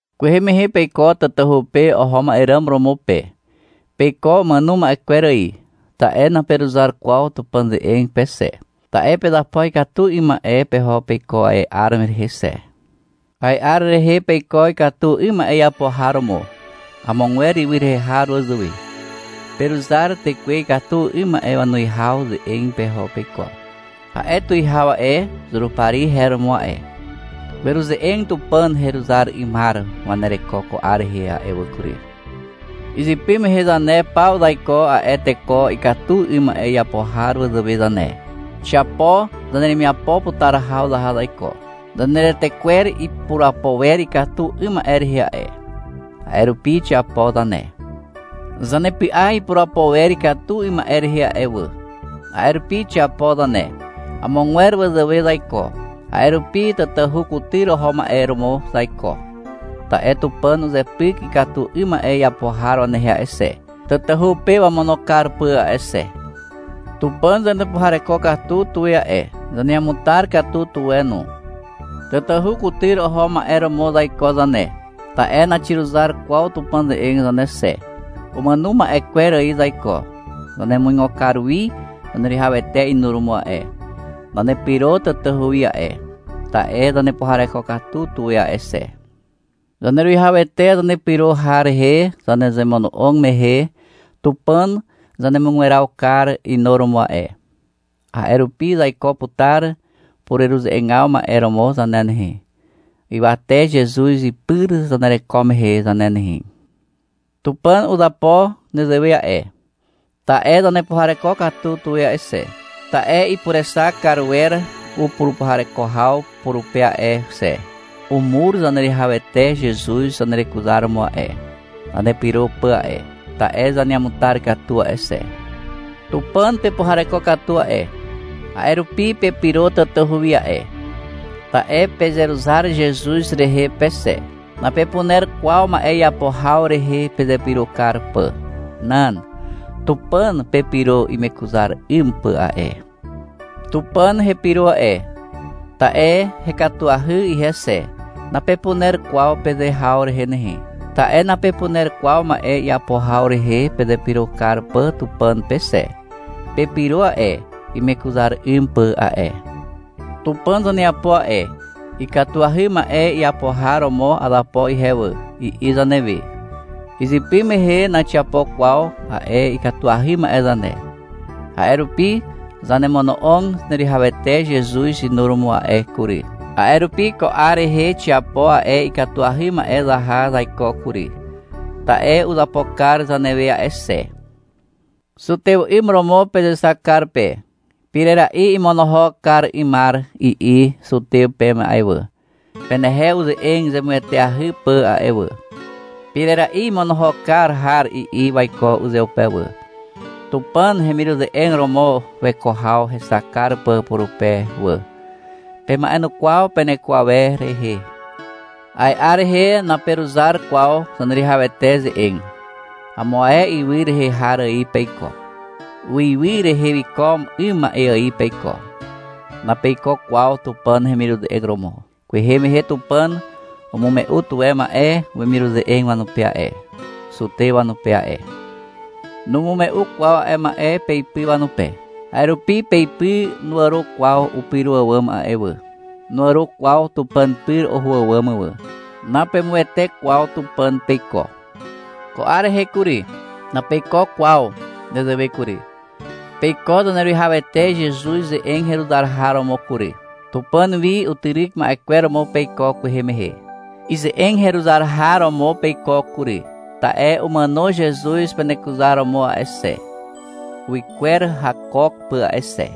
Kwehe mehe peiko tatahu pe oho ma'e ràm romo pe. Peiko umàno ma'e kwer ài. Ta'e naperuzar kwaw Tupàn ze'eg pe xe. Ta'e pezapo ikatu 'ym ma'e peho peiko a'e 'ar rehe xe. A'e 'ar rehe peiko ikatu 'ym ma'e iapo har romo, amogwer ywy rehe har wazàwe. Peruzar tekwe ikatu 'ym ma'e wanuwihaw ze'eg peho peiko. A'e tuwihaw a'e, Zurupari her romo a'e. Weruze'eg Tupàn ze'eg heruzar 'ymar wanereko ko 'ar rehe a'e wà kury. Izypy mehe zane paw zaiko a'e teko ikatu 'ym ma'e iapo har wazàwe zane. Xiapo zaneremiapo putar haw zaha zaiko. Zaneretekwer ipurapo wer ikatu 'ym ma'e rehe a'e. A'e rupi xiapo zane. Zanepy'a ipurapo wer ikatu 'ym ma'e rehe a'e wà. A'e rupi xiapo zane. Amogwer wazàwe zaiko. A'e rupi tatahu kutyr oho ma'e romo zaiko. Ta'e Tupàn uzepyk ikatu 'ym ma'e iapo har wanehe a'e xe, tatahu pe wamono kar pà a'e xe. Tupàn zanepuhareko katu tuwe a'e. Zaneamutar katu tuwe no. Tatahu kutyr oho ma'e romo zaiko zane, ta'e naxiruzar kwaw Tupàn ze'eg zane xe. Umàno ma'e kwer ài zaiko. Zanemuigo kar wi Zaneruwihawete inuromo a'e. Zanepyro tatahu wi a'e, ta'e zanepuhareko katu tuwe a'e xe. Zaneruwihawete Zanepyro har rehe zanezemono'og mehe, Tupàn zanemugweraw kar inuromo a'e. A'e rupi zaiko putar pureruze'eg ma'e romo zane nehe, ywate Zezuz ipyr zanereko mehe zane nehe. Tupàn uzapo nezewe a'e, ta'e zanepuhareko katu tuwe a'e xe, ta'e ipurexak kar wer upurupuhareko haw purupe a'e xe. Umur Zaneruwihawete Zezuz zanerekuzaromo a'e, zanepyro pà a'e, ta'e zaneamutar katu a'e xe. Tupàn pepuhareko katu a'e, a'e rupi pepyro tatahu wi a'e. Ta'e pezeruzar Zezuz rehe pe xe. Napepuner kwaw ma'e iapo haw rehe pezepyro kar pà. Nan. Tupàn pepyro imekuzar kar 'ym pà a'e. — Tupàn hepyro a'e, ta'e hekatuahy ihe xe, napepuner kwaw peze haw rehe nehe, ta'e napepuner kwaw ma'e iapo haw rehe pezepyro kar pà Tupàn pe xe. Pepyro a'e, imekuzar kar 'ym pà a'e. Tupàn zaneapo a'e. — Ikatuahy ma'e iapo har romo azapo ihe wà, i'i zanewe. Izypy mehe naxiapo kwaw a'e ikatuahy ma'e zane. A'e rupi zanemono'og Zaneruwihawete Zezuz inuromo a'e kury. A'e rupi ko 'ar rehe xiapo a'e ikatuahy ma'e zaha zaiko kury. Ta'e uzapo kar zanewe a'e xe. Zutew 'ym romo pezexak kar pe. — Pirera'i imonohok kar 'ymar, i'i zutew peme a'e wà, penehe uze'eg zemueteahy pà a'e wà. — Pirera'i imonohok kar har, i'i waiko uzeupe wà, Tupàn hemiruze'eg romo weko haw hexak kar pà purupe wà. Pema'enukwaw peneko awer rehe. A'e 'ar rehe naperuzar kwaw Zaneruwihawete ze'eg. Amo ae ywy rehe har ài peiko. Uiwy rehe wiko 'ym ma'e ài peiko. Napeiko kwaw Tupàn hemiruze'eg romo. Kwehe mehe Tupàn umume'u tuwe ma'e wemiruze'eg wanupe a'e, zutew wanupe a'e. Numume'u kwaw a'e ma'e peipy wanupe. A'e rupi peipy nuàro kwaw upyro àwàm a'e wà. Nuàro kwaw Tupàn pyr oho àwàm wà. Napeàro kwaw pe no. Napemuwete kwaw Tupàn peiko. Ko 'ar rehe kury, napeiko kwaw nezewe kury. Peiko Zaneruwihawete Zezuz ze'eg heruzar har romo kury. Tupàn wi utyryk ma'e romo peiko kwehe mehe. Ize'eg heruzar har romo peiko kury, ta'e umàno Zezuz penekuzaromo a'e xe, uwykwer hakook pà a'e xe.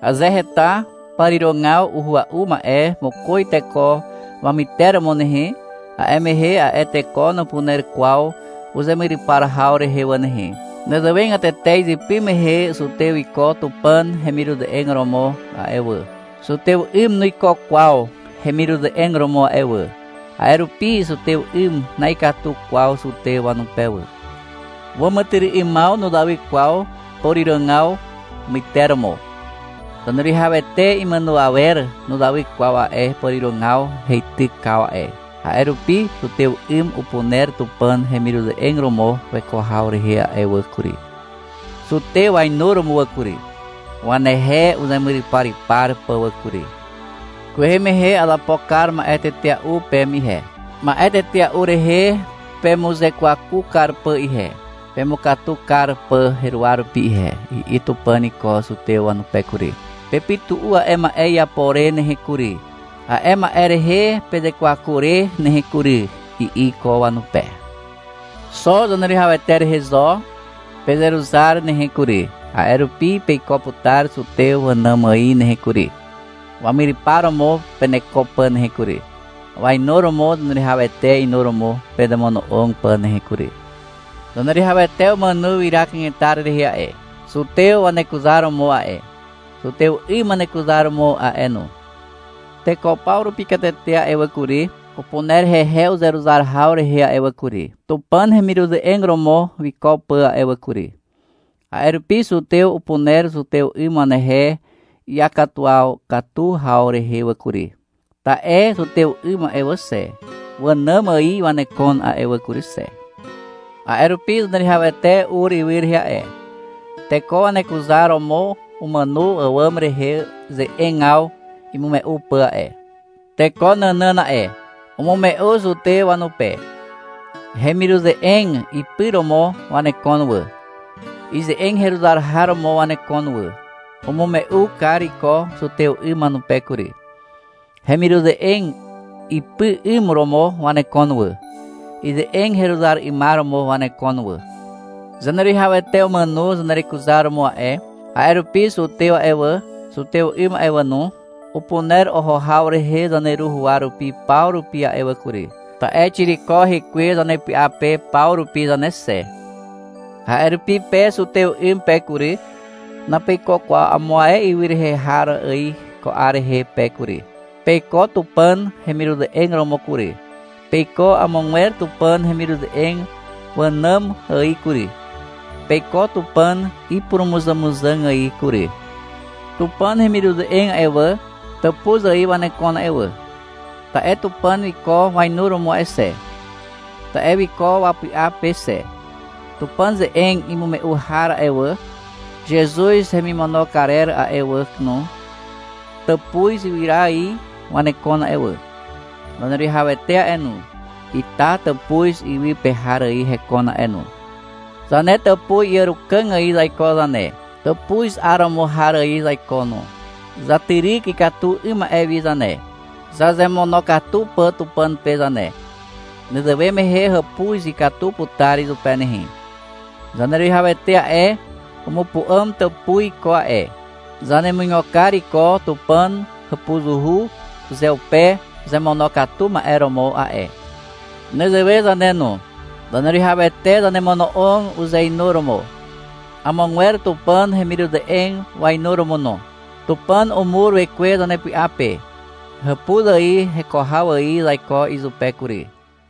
Aze heta pàrirogaw uhua'u ma'e mokoz teko wamyteromo nehe, a'e mehe a'e teko nupuner kwaw uzemyrypar haw rehe wà nehe. Nezewegatete izypy mehe zutew wiko Tupàn hemiruze'eg romo a'e wà. Zutew 'ym nuiko kwaw hemiruze'eg romo a'e wà. A'e rupi zutew 'ym na'ikatu kwaw zutew wanupe wà. Wàmàtyry'ymaw nuzawy kwaw pàrirogaw wamyteromo. Zaneruwihawete imàno awer nuzawy kwaw a'e pàrirogaw heitykaw a'e. A'e rupi zutew 'ym upuner Tupàn hemiruze'eg romo weko haw rehe wà kury, zutew wainuromo wà kury, wanehe uzemuryparypar pà wà kury. — Kwehe mehe azapo kar ma'e tetea'u peme ihe, ma'e tetea'u rehe pemuzekwaku kar pà ihe, pemukatu kar pà heruwa rupi ihe, i'i Tupàn iko zutew wanupe kury. — Pepytu'u a'e ma'e iapo re nehe kury, a'e ma'e rehe pezekwaku re nehe kury, i'i iko wanupe. — Xo Zaneruwihawete rehe zo pezeruzar nehe kury, a'e rupi peiko putar zutew wànàm ài nehe kury, wamyrypar romo peneko pà nehe kury, wainuromo Zaneruwihawete inuromo pezemono'og pà nehe kury. Zaneruwihawete umàno ywyra kanetar rehe a'e, zutew wanekuzar romo a'e, zutew 'ym wanekuzaromo a'e no. Teko paw rupi katete a'e wà kury, upuner hehe uzeruzar haw rehe a'e wà kury, Tupàn hemiruze'eg romo wiko pà a'e wà kury. A'e rupi zutew upuner zutew 'ym wanehe iakatuwaw katu haw rehe wà kury. Ta'e zutew 'ym a'e wà xe, wànàm ài wanekon a'e wà kury xe. A'e rupi Zaneruwihawete ur ywy rehe a'e, teko wanekuzaromo umàno àwàm rehe ze'egaw imume'u pà a'e, teko nànàn a'e. Umume'u zutew wanupe. Hemiruze'eg ipy romo wanekon wà. Ize'eg heruzar har romo wanekon wà. Umume'u kar iko zutew 'ym wanupe kury. Hemiruze'eg ipy 'ym romo wanekon wà. Ize'eg heruzar 'ymar romo wanekon wà. Zaneruwihawete umàno zanerekuzaromo a'e, a'e rupi zutew a'e wà, zutew 'ym a'e wà no, upuner oho haw rehe zaneru huwa rupi paw rupi a'e wà kury, ta'e xiriko hekwe zanepy'a pe paw rupi zane xe. A'e rupi pe zutew 'ym pe kury, napeiko kwaw amo ae ywy rehe har ài ko 'ar rehe pe kury. Peiko Tupàn hemiruze'eg romo kury. Peiko amogwer Tupàn hemiruze'eg wànàm ài kury. Peiko Tupàn ipurumuzàmuzàg ài kury. Tupàn hemiruze'eg a'e wà, tàpuz ài wanekon a'e wà, ta'e Tupàn wiko wainuromo a'e xe. Ta'e wiko wapy'a pe xe. Tupàn ze'eg imume'u har a'e wà, Zezuz hemimono karer a'e wà no, tàpuz ywyra ài wanekon a'e wà. Zaneruwihawete a'e no, ita tàpuz iwy pe har ài hekon a'e no. Zane tàpuz iàrukàg ài zaiko zane. Tàpuz 'aromo har ài zaiko no. Zatyryk ikatu 'ym ma'e wi zane, zazemonokatu pà Tupàn pe zane. Nezewe mehe hàpuz ikatu putar izupe nehe. Zaneruwihawete a'e, umupu'àm tàpuz iko a'e. Zanemuigo kar iko Tupàn hàpuzuhu uzeupe uzemonokatu ma'e romo a'e. Nezewe zane no. Zaneruwihawete zanemono'og uzeinuromo, amogwer Tupàn hemiruze'eg wainuromo no. Tupàn umur Wekwe zanepy'a pe. Hàpuz ài heko haw ài zaiko izupe kury.